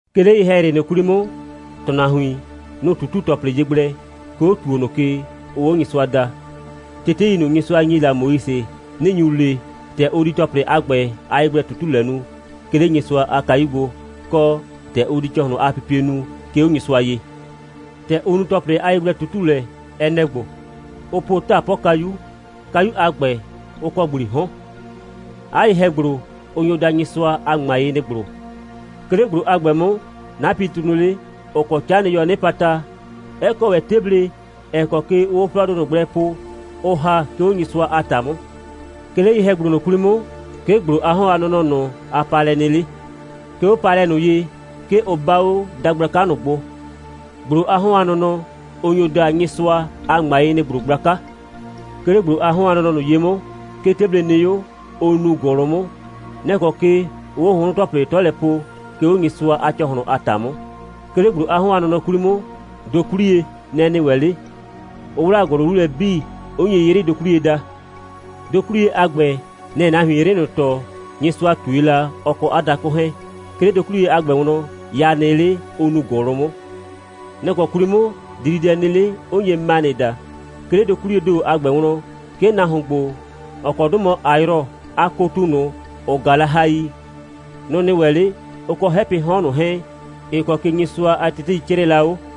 'Ke 'le ye‑hɛyrɩ 'kwli 'mʋ, ‑tʋnahuin, nʋ‑ ꞊tutu ‑tɔplɩ ye gblɛ, 'ke 'o ‑tuo ꞊nʋ ke, ʋʋ 'o Nyɩsʋa daa. Tetei ꞊nʋ, Nyɩsʋa ‑nyi la Moise, nɩ‑ nyu le, ‑tɛ ʋ di ‑tɔplɩ a ‑gbɛ a yegblɛ꞊tutulɛ nu, 'ke 'le Nyɩsʋa a kayu gbo, kɔ, ‑tɛ ʋ di ‑cɔhlɩn a pipie nu, 'ke 'o Nyɩsʋa ye. ‑Tɛ ʋ nu ‑tɔplɩ a ‑gbɛ a yegblɛ꞊tutulɛ, ɛ nɛ‑ ‑gbo: Ʋ po 'taapɔkayu. Kayu a ‑gbɛ, ʋ kɔ ‑gblii 'hɔn. 'A ye‑hɛ‑gblo, ʋ nyo daa Nyɩsʋa a ‑ŋmayenɩ‑gblo. 'Ke 'le ‑gblo a ‑gbɛ 'mʋ, 'napɩtu nɩ 'le, ‑ʋ kɔ 'canɩyɔɔ 'nɩpata, 'ɛ kɔ ‑wɛ 'teble, ‑ɛ kɔ ke ʋʋ 'o 'flɔɔdʋ ꞊nʋ gblɛ po, ʋʋ ‑ha, 'ke 'o Nyɩsʋa a ‑ta 'mʋ. 'Ke 'le ye‑hɛ‑gblo ꞊nʋ 'kwli 'mʋ, 'ke ‑gblo a 'hɔn a nɔnɔ ꞊nʋ a paalɛ nɩ 'le. 'Ke 'o 'a paalɛ ꞊nʋ ye, 'ke ʋ 'baa 'o dagblaka ꞊nʋ gbo. ‑Gblo a 'hɔn a nɔnɔ, ʋ nyo daa Nyɩsʋa a ‑ŋmayenɩ‑gblo gblaka. 'Ke 'le ‑gblo a 'hɔn a nɔnɔ ye 'mʋ, 'ke 'teble nɩ 'o, ʋ nuu ‑gʋlʋ 'mʋ. Nɛ‑ kɔ ke ʋʋ 'o hʋnhrʋnpo‑tɔplɩ 'tɔ lɛ po, 'ke 'o Nyɩsʋa a ‑cɔhlʋn a ‑ta 'mʋ. 'Ke 'le ‑gblo a 'hɔn a nɔnɔ 'kwli 'mʋ, dokwliye, nɛ‑ nɩ ‑wɛ 'le, ʋ 'wlaa ‑gʋlʋ 'lu lɛ 'bii, 'ʋ nye 'yrɩdokwliye daa. Dokwliye a ‑gbɛ, nɛ‑ɛ nahuin 'yrɩ ꞊nʋ tɔɔ, Nyɩsʋa ꞊tue la, ɔ kɔ 'a dakʋ 'hɛɛn. 'Ke 'le dokwliye a ‑gbɛ wlɔn, ya nɩ 'le, ʋ nuu ‑gʋlʋ 'mʋ. Nɔ‑ kɔ 'kwli 'mʋ dididɛ nɩ 'le, 'ʋ nye manɩ daa. 'Ke 'le dokwliyee ‑do a ‑gbɛ wlɔn, 'ke nahuon ‑gbo, ‑ɔ kɔ 'dʋ mɔ Ayrɔ a kotu ꞊nʋ, ‑ʋ ꞊gaa la hai, nʋ‑ nɩ ‑wɛ 'le, ʋ kɔ 'hɛpɩɩ 'hɔn ꞊nʋ 'hɛɛn, ‑ɩ kɔ ke Nyɩsʋa a tetei 'crɛɛ la 'o.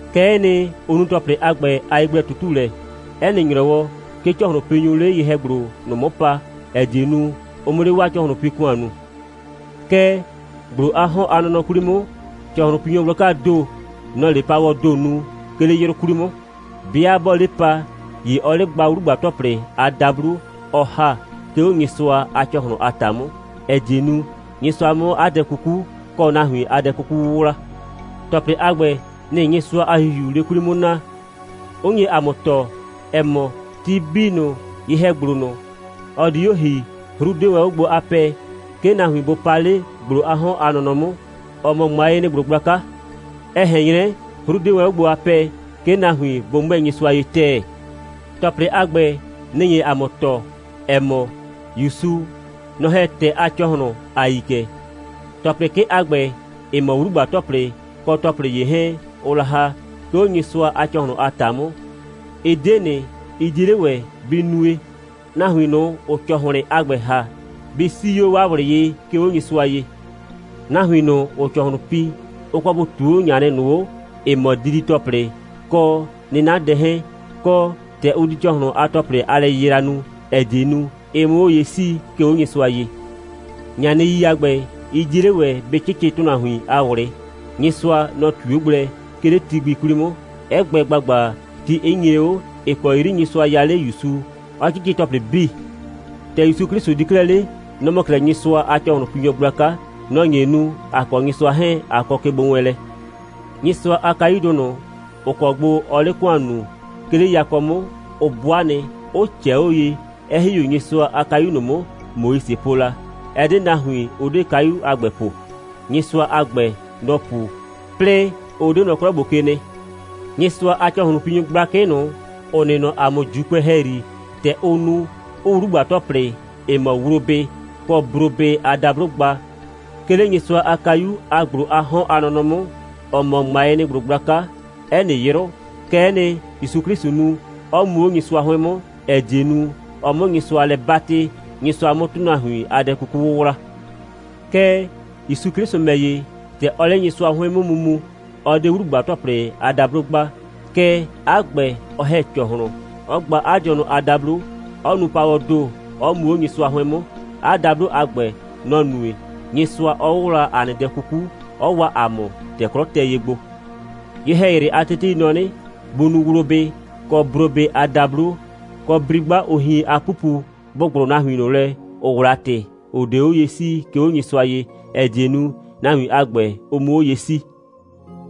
Kɛ'ɛ nɩ, ʋ nu ‑tɔplɩ 'bii a ‑gbɛ a yegblɛ꞊tutulɛ. 'Ɛ nɩ ‑nyrɔwɔ, 'ke ‑cɔhlʋnpinyʋʋ 'le ye‑hɛ‑gblo ꞊nʋ 'mʋ pa, ‑ɛ die nu, ʋ 'mʋ 'le 'waa ‑cɔhlʋnpi‑kʋan nuu. Kɛɛ, ‑gblo a 'hɔn a nɔnɔ 'kwli 'mʋ, ‑cɔhlʋnpinyɔ gblakaa ‑do, nɔ‑ɔ 'le paawɔɔ ‑do nu, 'ke 'le 'yrʋ 'kwli 'mʋ. 'Bɩa 'bɔɔ 'le pa, ‑ye ɔɔ 'le gba 'wlugba‑tɔplɩ a dablo, ɔ ‑ha, 'ke 'o Nyɩsʋa a ‑cɔhlʋn a ‑ta 'mʋ, ‑ɛ die nu, Nyɩsʋa 'mʋ 'a dɛ kuku, kɔ nahuin a dɛ 'kuku 'wʋwla. ‑Tɔplɩ a ‑gbɛ, nɩ‑ Nyɩsʋa a ‑Hihiuu 'le 'kwli 'mʋ naa, 'ʋ nye ‑a mʋ tɔɔ, ‑ɛ mɔ, ti 'bii ꞊nʋ, ye‑hɛ‑gblo ꞊nʋ, ɔ di 'o ‑hi, 'hru 'de wɛn 'o gbo a pɛɛ, 'ke nahuin bʋ pa 'le ‑gblo a 'hɔn a nɔnɔ 'mʋ, ‑ɔ mɔ ‑ŋmayenɩ‑gblo gblaka. Ɛ ꞊hɛn 'nyrɛ, 'hru 'de wɛn 'o gbo a pɛɛ, 'ke nahuin bʋ 'mʋɛɛ Nyɩsʋa ye ‑tɛɛ. ‑Tɔplɩ a ‑gbɛ, nɩ‑ nye ‑a mʋ tɔɔ, ‑ɛ mɔ, ‑Yusu, nɔ‑ ‑hɛ ‑tɛɛ a ‑cɔhlʋn, ‑a yi kɛ. ‑Tɔplɩ 'kɩ a ‑gbɛ, ‑ɩ mɔ 'wlugba‑tɔplɩ kɔ ‑tɔplɩ ‑ye 'hɛɛn, ʋʋ la ‑ha, 'ke 'o Nyɩsʋa a ‑cɔhlʋn a ‑ta 'mʋ, ɩ 'de ꞊nɩ, ɩ 'die 'le ‑wɛ bɩ nue, nahuin ꞊nʋ, ‑ʋʋ ‑cɔhlɩn a ‑gbɛ ‑ha, bɩ 'sii 'o 'waa ꞊wlɩ ye, 'ke 'o Nyɩsʋa ye. Nahuin ꞊nʋ, ‑ʋʋ ‑cɔhlʋn pi, ʋ kɔ bʋ ꞊tuu 'o ꞊ŋanɩ ꞊nʋ 'o, ‑ɩ mɔ didi‑tɔplɩ, kɔ 'nɩnadɛ 'hɛɛn, kɔ, ‑tɛ ʋ di ‑cɔhlʋn a ‑tɔplɩ a lɛyɩyra nu, ‑ɛ die nu, ɩ 'mʋ 'o ye 'sii, 'ke 'o Nyɩsʋa ye. ꞊Ŋanɩi a ‑gbɛ, ɩ 'die 'le ‑wɛ bɩ 'cɩcɩ ‑tʋnahuin a ꞊wlɩ. Nyɩsʋa, nɔ‑ ꞊tui 'o gblɛ, 'ke 'le ti gbi 'kwli 'mʋ, 'ɛ gbɛ ‑gbagba, ti 'ɩ nyre 'o, ‑ɩ kɔ 'yri Nyɩsʋa ya 'le ‑Yusu, 'ɔ 'cɩcɩ ‑tɔplɩ 'bii. ‑Tɛ ‑Yusu 'Klɩsʋ di 'klɛɛ 'le, nɔ‑ mɔ 'klɛɛ Nyɩsʋa a ‑cɔhlʋnpinyɔ gblaka. Nɔ‑ nye nu, ‑a kɔ Nyɩsʋa 'hɛɛn, ꞊a kɔ kegbowɛɛnlɛ. Nyɩsʋa a kayudʋ ꞊nʋ, ‑ʋ kɔ gbo ɔɔ 'le ‑kʋan nuu, 'ke 'le yakɔ 'mʋ, ʋ 'bʋa nɩ, 'ʋ ꞊cɛɛ 'o ye, 'ɛ ‑hi 'o Nyɩsʋa a kayu ꞊nʋ 'mʋ, Moise po la. Ɛ 'de nahuin, ʋ 'de kayudʋ a ‑gbɛ po. Nyɩsʋa a ‑gbɛ, nɔ‑ pu, 'plɩɩ, ʋ 'de nɔ 'klɔ ‑gbo ke nɩ. Nyɩsʋa a ‑cɔhlʋnpinyʋ gblakɩ ꞊nʋ, ‑ʋ nɩ nɔ ‑a mʋ ‑Juukʋɛ ‑hɛyri, ‑tɛ ʋʋ nu, 'ʋʋ 'wlugba‑tɔplɩ, ‑ɩ mɔ wlobɩ kɔ brobɩ a dablo gba, 'ke 'le Nyɩsʋa a kayu a ‑gblo a 'hɔn a nɔnɔ 'mʋ, ‑ɔ mɔ ‑ŋmayenɩ‑gblo gblaka, 'ɛ nɩ 'yrʋ, kɛ'ɛ nɩ, ‑Yusu 'Klɩsʋ nu, 'ɔ mu 'o Nyɩsʋa 'hʋɩn 'mʋ, ‑ɛ die nu, ɔ 'mʋ Nyɩsʋa lɛ 'batɩ, Nyɩsʋa 'mʋ ‑tʋnahuin a dɛ 'kuku 'wʋwla. Kɛɛ, ‑Yusu 'Klɩsʋ ‑mɛ ‑ye, ‑tɛ ɔɔ 'le Nyɩsʋa 'hʋɩn 'mʋ mu mu, ɔ 'de 'wlugba‑tɔplɩ a dablo gba, kɛɛ, 'a ‑gbɛ, ɔ ‑hɛ ‑cɔhlʋn, 'ɔ gba 'a dɩɔnʋ a dablo, 'ɔ nu paawɔɔ ‑do, 'ɔ mu 'o Nyɩsʋa 'hʋɩn 'mʋ. 'A dablo a ‑gbɛ, nɔ‑ nue, Nyɩsʋa 'ɔ 'wʋwla ‑a nɩ dɛ 'kuku, 'ɔ waa ‑a mʋ, ‑tɛ 'klɔ tɛ ye gbo. Ye‑hɛyrɩ a tetei nɔ 'nɩ, bʋ nu wlobɩ kɔ brobɩ a dablo, kɔ bri'gba, ʋ hien a 'pupu, bʋ ‑gblʋ nahuin ꞊nʋ lɛ, ‑ʋ 'wla ‑tɩ, ‑ʋ 'de 'o ye 'sii, 'ke 'o Nyɩsʋa ye, ‑ɛ die nu, nahuin a ‑gbɛ, ʋ 'mʋ 'o ye 'sii.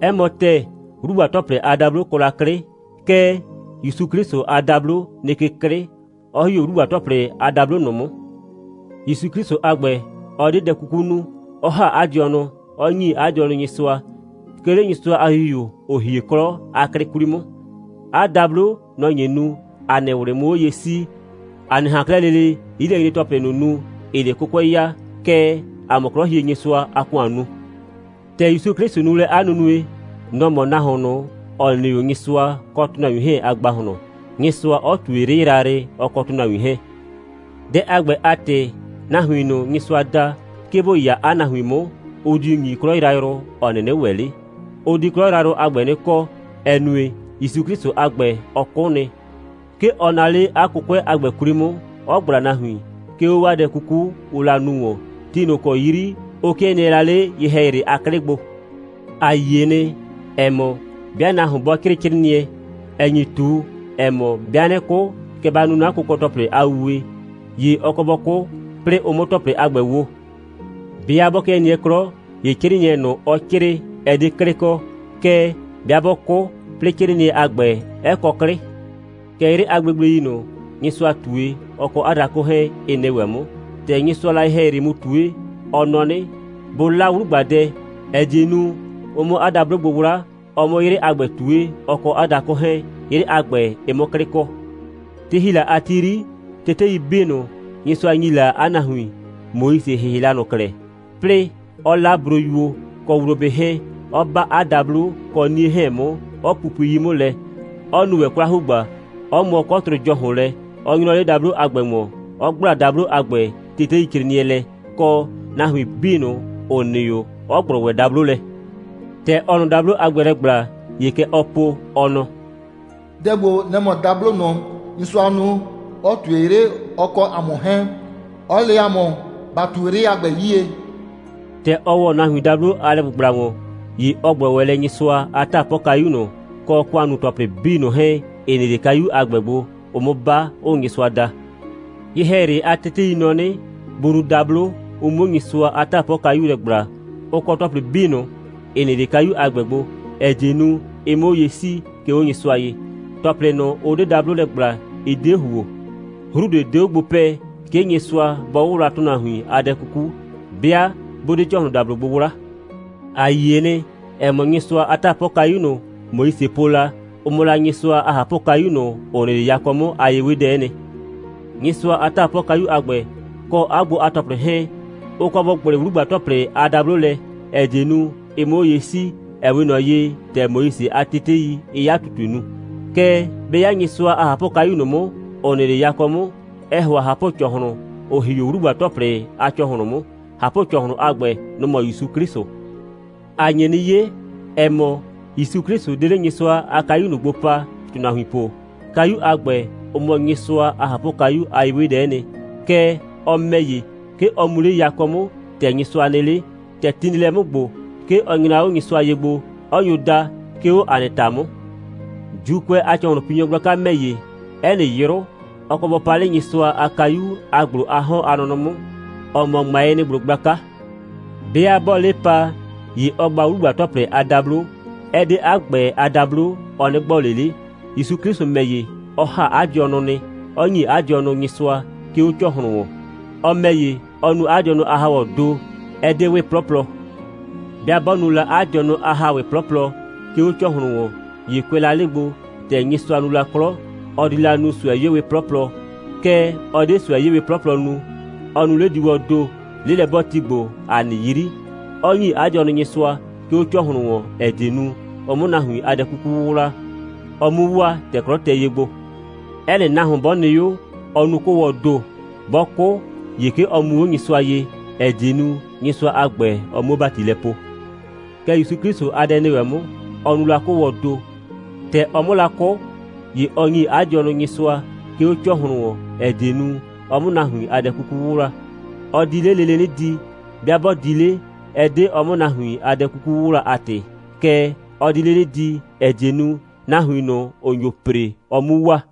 'Ɛ ‑mɔ ‑tɛɛ, 'wlugba‑tɔplɩ a dablo kɔ la 'klɩ, kɛɛ, ‑Yusu 'Klɩsʋ a dablo nɩ ke 'klɩ, 'ɔ ‑hi 'o 'wlugba‑tɔplɩ a dablo ꞊nʋ 'mʋ. ‑Yusu 'Klɩsʋ a ‑gbɛ, ɔ 'de dɛ 'kuku nu, 'ɔ ‑ha 'a dɩɔnʋ, 'ɔ ‑nyi 'a dɩɔnʋ Nyɩsʋa, 'ke 'le Nyɩsʋa a ‑Hihiu, ‑ʋ hie 'klɔ a 'klɩ 'kwli 'mʋ. 'A dablo, nɔ‑ nye nu, ‑a nɩ ꞊wlɩ 'mʋ 'o ye 'sii, ‑a 'nɩ ꞊han 'klɛɛ lele 'yilɛnyre‑tɔplɩ ꞊nʋ nu, ‑ɩɩ 'le 'kʋkʋɛ ya, kɛɛ, ‑a 'mʋ 'Klɔhienyɩsʋa a ‑kʋan nu. ‑Tɛ ‑Yusu 'Klɩsʋ nu lɛ 'a nunue, nɔ‑ mɔ nahuon ꞊nʋ, ‑ɔ nɩ 'o Nyɩsʋa kɔ ‑tʋnahuin 'hɛɛn a ‑gbahlɔn, Nyɩsʋa 'ɔ ꞊tue 'yrɩ yrayrɩ, ɔ kɔ ‑tʋnahuin 'hɛɛn. Dɛ a ‑gbɛ a ‑tɩ, nahuin ꞊nʋ, Nyɩsʋaa da, 'ke bʋ 'ya 'a nahuin 'mʋ, ɔ diu ‑nyi 'klɔ yrayrʋ, ‑ɔ 'nɩnɩ ‑wɛ 'le. Ʋ di 'klɔ yrayrʋ a ‑gbɛ 'nɩ kɔ, ‑ɛ nue, ‑Yusu 'Klɩsʋ a ‑gbɛ, ɔ 'kʋ nɩ. 'Ke ɔ naa 'le 'a 'kʋkʋɛ a ‑gbɛ 'kwli 'mʋ, 'ɔ ꞊gbla nahuin, 'ke 'o 'waa dɛ 'kuku, ʋʋ la nu ‑wɔn, ti ꞊nʋ ‑kɔ 'yri ʋ 'kɩɛ nɩɛ la 'le ye‑hɛyrɩ a 'klɩ gbo. ‑A yie nɩ, ‑ɛ mɔ, 'bɩa nahuon 'bɔ 'crɩɩ 'crɩɩnɩɛ, ‑ɛ nyi ꞊tu, ‑ɛ mɔ: «'Bɩa 'nɩ 'kʋ, kɛ ba nu 'na kʋkɔ‑tɔplɩ a wuwe,» ‑ye ɔ kɔ bɔ 'kʋ, 'plɩɩ ʋ 'mʋ ‑tɔplɩ a ‑gbɛ wo. 'Bɩa 'bɔ 'kɩɛ nɩɛ 'klɔ, ‑ye 'crɩɩnɩɛ ꞊nʋ, ɔ 'crɩɩ, ɛ 'de 'klɩ kɔ. Kɛɛ, 'bɩa 'bɔ 'kʋ, 'plɩɩ 'crɩɩnɩɛ a ‑gbɛ, 'ɛ kɔ 'klɩ. Kɛ 'yrɩ a gblegblei ꞊nʋ, Nyɩsʋa ꞊tue, ɔ kɔ 'a dakʋ 'hɛɛn, ɩ nɩ ‑wɛ 'mʋ. ‑Tɛ Nyɩsʋaa la ye‑hɛyrɩ mu ꞊tue, ɔ nɔ 'nɩ, bʋ 'la 'wlugbadɛ, ‑ɛ die nu, ʋ 'mʋ 'a dablo gbo 'wla, ɔ 'mʋ 'yrɩ a ‑gbɛ ꞊tue, ɔ kɔ 'a dakʋ 'hɛɛn, 'yrɩ a ‑gbɛ, ɩ 'mʋ 'klɩ kɔ. Ti ‑hi la a ti 'yri, tetei 'bii ꞊nʋ, Nyɩsʋa ‑nyi la 'a nahuin, Moise ‑hɩhɩ la ꞊nʋ klɛ, 'plɩɩ 'ɔ 'la broyuo [kɔ wlobɩ 'hɛɛn], 'ɔ 'ba 'a dablo kɔ 'nie 'hɛɛn 'mʋ, 'ɔ pupui 'yi 'mʋ lɛ, 'ɔ nu ‑wɛ 'kwla‑hugba, 'ɔ mʋɔ 'kɔtrʋ ‑jɔhʋn lɛ, 'ɔ 'nyrʋ 'le dablo a ‑gbɛ ‑wɔn, 'ɔ ‑gbla dablo a ‑gbɛ teteicrɩɩnɩɛ lɛ, kɔ, nahuin 'bii ꞊nʋ, ‑ʋ nɩ 'o, 'ɔ ‑gblʋ ‑wɛ dablo lɛ. ‑Tɛ ɔɔ ꞊nʋ dablo a ‑gbɛ lɛ ‑gbla, ‑ye kɛ ɔɔ po, ɔ nɔ: «Dɛ ‑gbo, nɛ‑ mɔ dablo ꞊nʋ, Nyɩsʋaa nu, 'ɔ ꞊tue 'yrɩ, ɔ kɔ 'a mʋ 'hɛɛn, 'ɔ le 'a mʋ, ba ꞊tu 'yrɩ a ‑gbɛ 'yie.» ‑Tɛ ɔ ‑wɔ nahuin dablo a lɛ‑gbʋgbla ‑wɔn, ‑ye ɔ ‑gblɔ ‑wɛ lɛ Nyɩsʋa a 'taapɔkayu ꞊nʋ, kɔ ‑kʋannuu‑tɔplɩ 'bii ꞊nʋ 'hɛɛn, ‑ɩ nɩ 'le kayu a ‑gbɛ gbo, ʋʋ 'mʋ 'ba, 'ʋʋ Nyɩsʋa da. Ye‑hɛyrɩ a tetei nɔ 'nɩ, bʋ nu dablo, ʋ 'muo Nyɩsʋa a 'taapɔkayu lɛ ‑gbla, ʋ kɔ ‑tɔplɩ 'bii ꞊nʋ, ‑ɩ nɩ 'le kayu a ‑gbɛ gbo, ‑ɛ die nu, ɩ 'mʋ 'o ye 'sii, 'ke 'o Nyɩsʋa ye. ‑Tɔplɩ ꞊nʋ, ʋ 'de dablo lɛ ‑gbla, ɩ 'de ‑huo. 'Hru ꞊de 'de 'o gbo pɛ, 'ke Nyɩsʋa bɔ 'wʋwla ‑tʋnahuin a dɛ 'kuku, 'bɩa 'bʋ 'de ‑cɔhlʋndablo gbo 'wla. ‑A yie nɩ, ‑ɛ mɔ, Nyɩsʋa a 'taapɔkayu ꞊nʋ, Moise po la, ʋ mɔ la Nyɩsʋa a ꞊hapʋkayu ꞊nʋ, ‑ʋ nɩ 'le yakɔ 'mʋ a ye'wedɛ'ɛ nɩ. Nyɩsʋa a 'taapɔkayu a ‑gbɛ, kɔ 'a gbo a ‑tɔplɩ 'hɛɛn, ʋ kɔ bʋ ‑gblɩ 'wlugba‑tɔplɩ a dablo lɛ, ‑ɛ die nu, ɩ 'mʋ 'o ye 'sii, ‑ɛ 'we ꞊nɔ ye, ‑tɛ Moise a tetei, ɩɩ 'a ꞊tutue nu. Kɛɛ, 'bɛ 'ya Nyɩsʋa a ꞊hapʋkayu ꞊nʋ 'mʋ, ‑ʋ nɩ 'le yakɔ 'mʋ, ɛɛ ‑hʋa ꞊hapʋ‑cɔhlʋn, ‑ʋ ‑hi 'o 'wlugba‑tɔplɩ a ‑cɔhlʋn 'mʋ. ꞊Hapʋ‑cɔhlʋn a ‑gbɛ, nʋ‑ mɔ ‑Yusu 'Klɩsʋ. ‑A nye 'nɩ 'ye, ‑ɛ mɔ, ‑Yusu 'Klɩsʋ 'de 'le Nyɩsʋa a kayu ꞊nʋ gbo pa, ‑tʋnahuin po. Kayu a ‑gbɛ, ʋ mɔ Nyɩsʋa a ꞊hapʋkayu a ye'wedɛ'ɛ nɩ. Kɛɛ, ɔ ‑mɛ ‑ye, 'ke ɔ mu 'le yakɔ 'mʋ, ‑tɛ Nyɩsʋa nɩ 'le. ‑Tɛ ti nɩ lɛ 'mʋ ‑gbo, 'ke ɔ nyra 'o Nyɩsʋa ye gbo, 'ɔ nyo da, 'ke 'o ‑a nɩ ‑ta 'mʋ. ‑Juukʋɛ a ‑cɔhlʋnpinyɔ gblaka ‑mɛ ‑ye, 'ɛ nɩ 'yrʋ, ɔ kɔ bɔ pa 'le Nyɩsʋa a kayu a ‑gblo a 'hɔn a nɔnɔ 'mʋ, ‑ɔ mɔ ‑ŋmayenɩ‑gblo gblaka. 'Bɩa 'bɔɔ 'le pa, ‑ye ɔɔ gba 'wlugba‑tɔplɩ a dablo. Ɛ 'de 'a ‑gbɛ a dablo, ɔ 'nɩ gbɔ ꞊le 'le. ‑Yusu 'Klɩsʋ ‑mɛ ‑ye, ɔ ‑ha 'a dɩɔnʋ nɩ, 'ɔ ‑nyi 'a dɩɔnʋ Nyɩsʋa, 'ke 'o ‑cɔhlʋn ‑wɔn. Ɔ ‑mɛ ‑ye, ɔ nu 'a dɩɔnʋ a ‑haawɔɔ ‑do, ɛ 'de 'wɩ 'plɔplɔ. 'Bɩa 'bɔ nu la 'a dɩɔnʋ a ‑haawɩ 'plɔplɔ, 'ke 'o ‑cɔhlʋn ‑wɔn, ‑ye kʋɛ la 'le gbo, ‑tɛ Nyɩsʋa nu la 'klɔ, ɔ di la nu ꞊sʋɛ'yeewɩ 'plɔplɔ. Kɛɛ, ɔ 'de ꞊sʋɛ'yeewɩ 'plɔplɔ nu. Ɔ nu 'lediiwɔɔ ‑do, 'lelɛ'bɔɔti ‑gbo, ‑a nɩ 'yri, 'ɔ ‑nyi 'a dɩɔnʋ Nyɩsʋa, 'ke 'o ‑cɔhlʋn ‑wɔn, ‑ɛ die nu, ɔ 'mʋ nahuin a dɛ 'kuku 'wʋwla, ɔ 'mu waa, ‑tɛ 'klɔ tɛ ye gbo. 'Ɛ nɩ nahuon 'bɔ nɩ 'o, ɔɔ nu 'kʋʋwɔɔ ‑do. 'Bɔ 'kʋ, ‑ye 'ke ɔ mu 'o Nyɩsʋa ye, ‑ɛ die nu, Nyɩsʋa a ‑gbɛ, ɔ 'muo ‑bati lɛ poo. Kɛ ‑Yusu 'Klɩsʋ a dɛ nɩ ‑wɛ 'mʋ. Ɔ nu la 'kʋʋwɔɔ ‑do. ‑Tɛ ɔ 'mʋ la 'kʋ, ‑ye ɔ ‑nyi 'a dɩɔnʋ Nyɩsʋa, 'ke 'o ‑cɔhlʋn ‑wɔn, ‑ɛ die nu, ɔ 'mʋ nahuin a dɛ 'kuku 'wʋwla. Ɔ di 'le lele 'nɩ di. 'Bɩa 'bɔ di 'le, ɛ 'de ɔ 'mʋ nahuin a dɛ 'kuku 'wʋwla a ‑tɩ. Kɛɛ, ɔ di 'le 'nɩ di, ‑ɛ die nu, nahuin ꞊nʋ, ‑ʋ nyo ‑pre, ɔ 'mu waa.